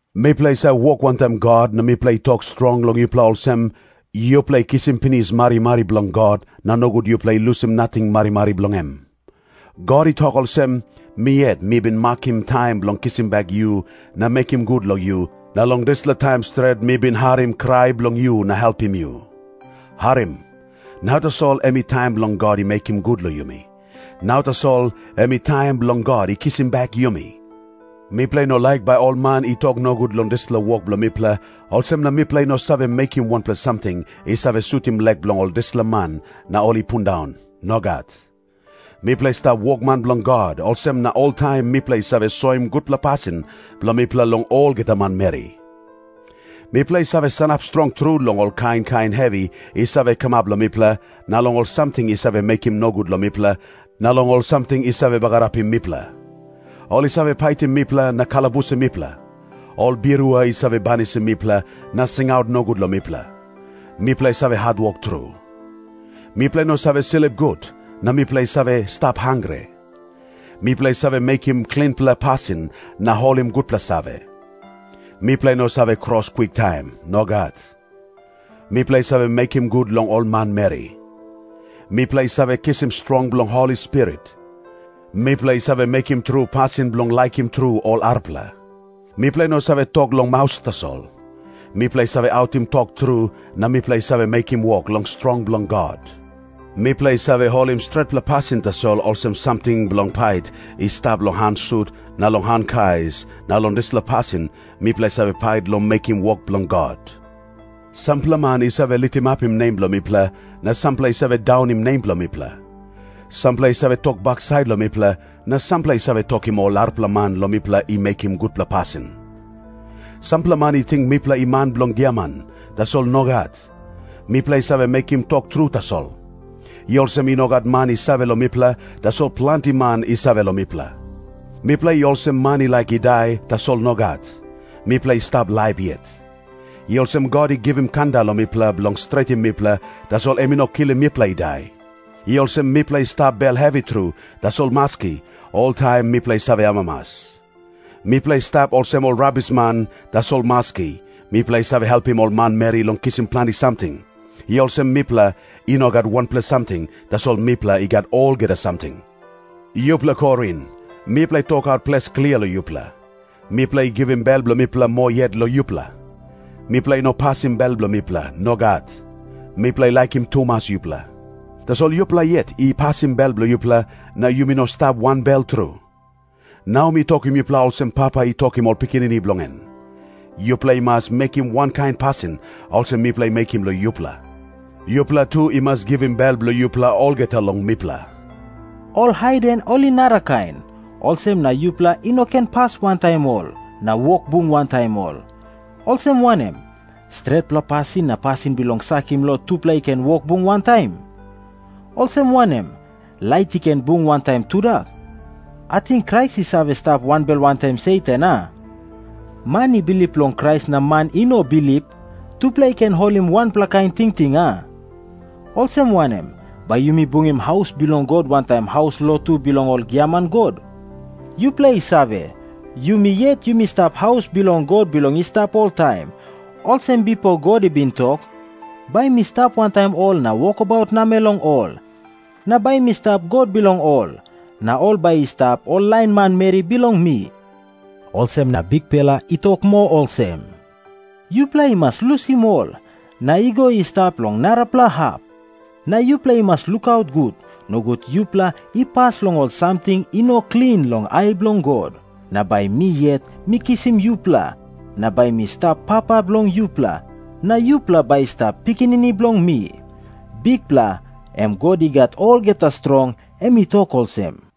Mipela i save wok wantaim God na mipela i tok strong long yupela olsem, “Yupela i kisim pinis marimari bilong God, na nogut yupela i lusim nating marimari bilong em.” God i tok olsem, “Mi yet mi bin makim taim bilong kisim bek yu na mekim gut long yu, na long dispela taim stret mi bin harim krai bilong yu na helpim yu.” Harim. Nau tasol em i taim bilong God i mekim gut long yumi. Nau tasol em i taim bilong God i kisim bek yumi. Mipela i no laik bai ol man i tok nogut long dispela wok bilong mipela, olsem na mipela i no save mekim wanpela samting i save sutim lek bilong ol dispela man na ol i pundaun. Nogat. Mipela i stap wokman bilong God, olsem na oltaim mipela i save soim gutpela pasin bilong mipela long olgeta manmeri. Mipela i save sanap strong tru long ol kain kain hevi i save kamap long mipela, na long ol samting i save mekim nogut long mipela, na long ol samting i save bagarapim mipela. Ol i save paitim mipela na kalabusim mipela. Ol birua i save banisim mipela na singaut nogut long mipela. Mipela i save hatwok tru. Mipela i no save slip gut, na mipela i save stap hangre. Mipela i save mekim klinpela pasin na holim gutpela save. Mipela i no save kros kwiktaim. Nogat. Mipela i save mekim gut long ol manmeri. Mipela i save kisim strong bilong Holi Spirit. Mipela i save mekim tru pasin bilong laikim tru ol arapela. Mipela i no save tok long maus tasol. Mipela i save autim tok tru, na mipela i save mekim wok long strong bilong God. Mipela i save holim stretpela pasin tasol olsem samting bilong pait i stap long han sut na long han kais, na long dispela pasin mipela i save pait long mekim wok bilong God. Sampela man i save litimapim nem bilong mipela, na sampela i save daunim nem bilong mipela. Sampela i save tok baksait long mipela, na sampela i save tokim ol arapela man long mipela i mekim gutpela pasin. Sampela man i ting mipela i man bilong giaman, tasol nogat, mipela i save mekim tok tru tasol. I olsem i no gat man i save long mipela, tasol planti man i save long mipela. Mipela i olsem man i laik i dai, tasol nogat, mipela i stap laip yet. I olsem God i givim kanda long mipela bilong stretim mipela, tasol em i no kilim mipela i dai. I olsem mipela i stap bel hevi tru, tasol maski, oltaim mipela i save amamas. Mipela i stap olsem ol rabisman, tasol maski, mipela i save helpim ol manmeri long kisim planti samting. I olsem mipela i no gat wanpela samting, tasol mipela i gat olgeta samting. Yupela Korin, mipela i tokaut ples klia long yupela. Mipela i givim bel bilong mipela moa yet long yupela. Mipela i no pasim bel bilong mipela. Nogat. Mipela i laikim tumas yupela. Tasol yupela yet i pasim bel bilong yupela, na yumi no stap wanbel tru. Nau mi tokim yupela olsem papa i tokim ol pikinini bilong en. Yupela i mas mekim wankain pasin olsem mipela i mekim long yupela. Yupela tu i mas givim bel bilong yupela olgeta long mipela. Ol haiden ol i narakain, olsem na yupela i no ken pas wantaim ol na wok bung wantaim ol. Olsem wanem, stretpela pasin na pasin bilong sakim lo tupela i ken wok bung wantaim? Olsem wanem, lait i ken bung wantaim tudak? Ating Krais i save stap wanbel wantaim Satan, a? Man i bilip long Krais na man i no bilip, tupela i ken holim wanpela kain tingting, a? Olsem wanem, bai yumi bungim haus bilong God wantaim haus lotu bilong ol giaman god? Yupela i save, yumi yet yumi stap haus bilong God bilong i stap oltaim, olsem bipo God i bin tok, “Bai mi stap wantaim ol na wokabaut namel long ol. Na bai mi stap God bilong ol, na ol bai i stap ol lain manmeri bilong mi.” Olsem na Bikpela i tok moa olsem, “ ‘Yupela i mas lusim ol, na i go i stap long narapela hap. Na yupela i mas lukaut gut, nogut yupela i pas long ol samting i no klin long ai bilong God. Na bai mi yet mi kisim yupela na bai mi stap Papa bilong yupela, na yupela bai i stap pikinini bilong mi.’ Bikpela, em God I Gat Olgeta Strong, em i tok olsem.”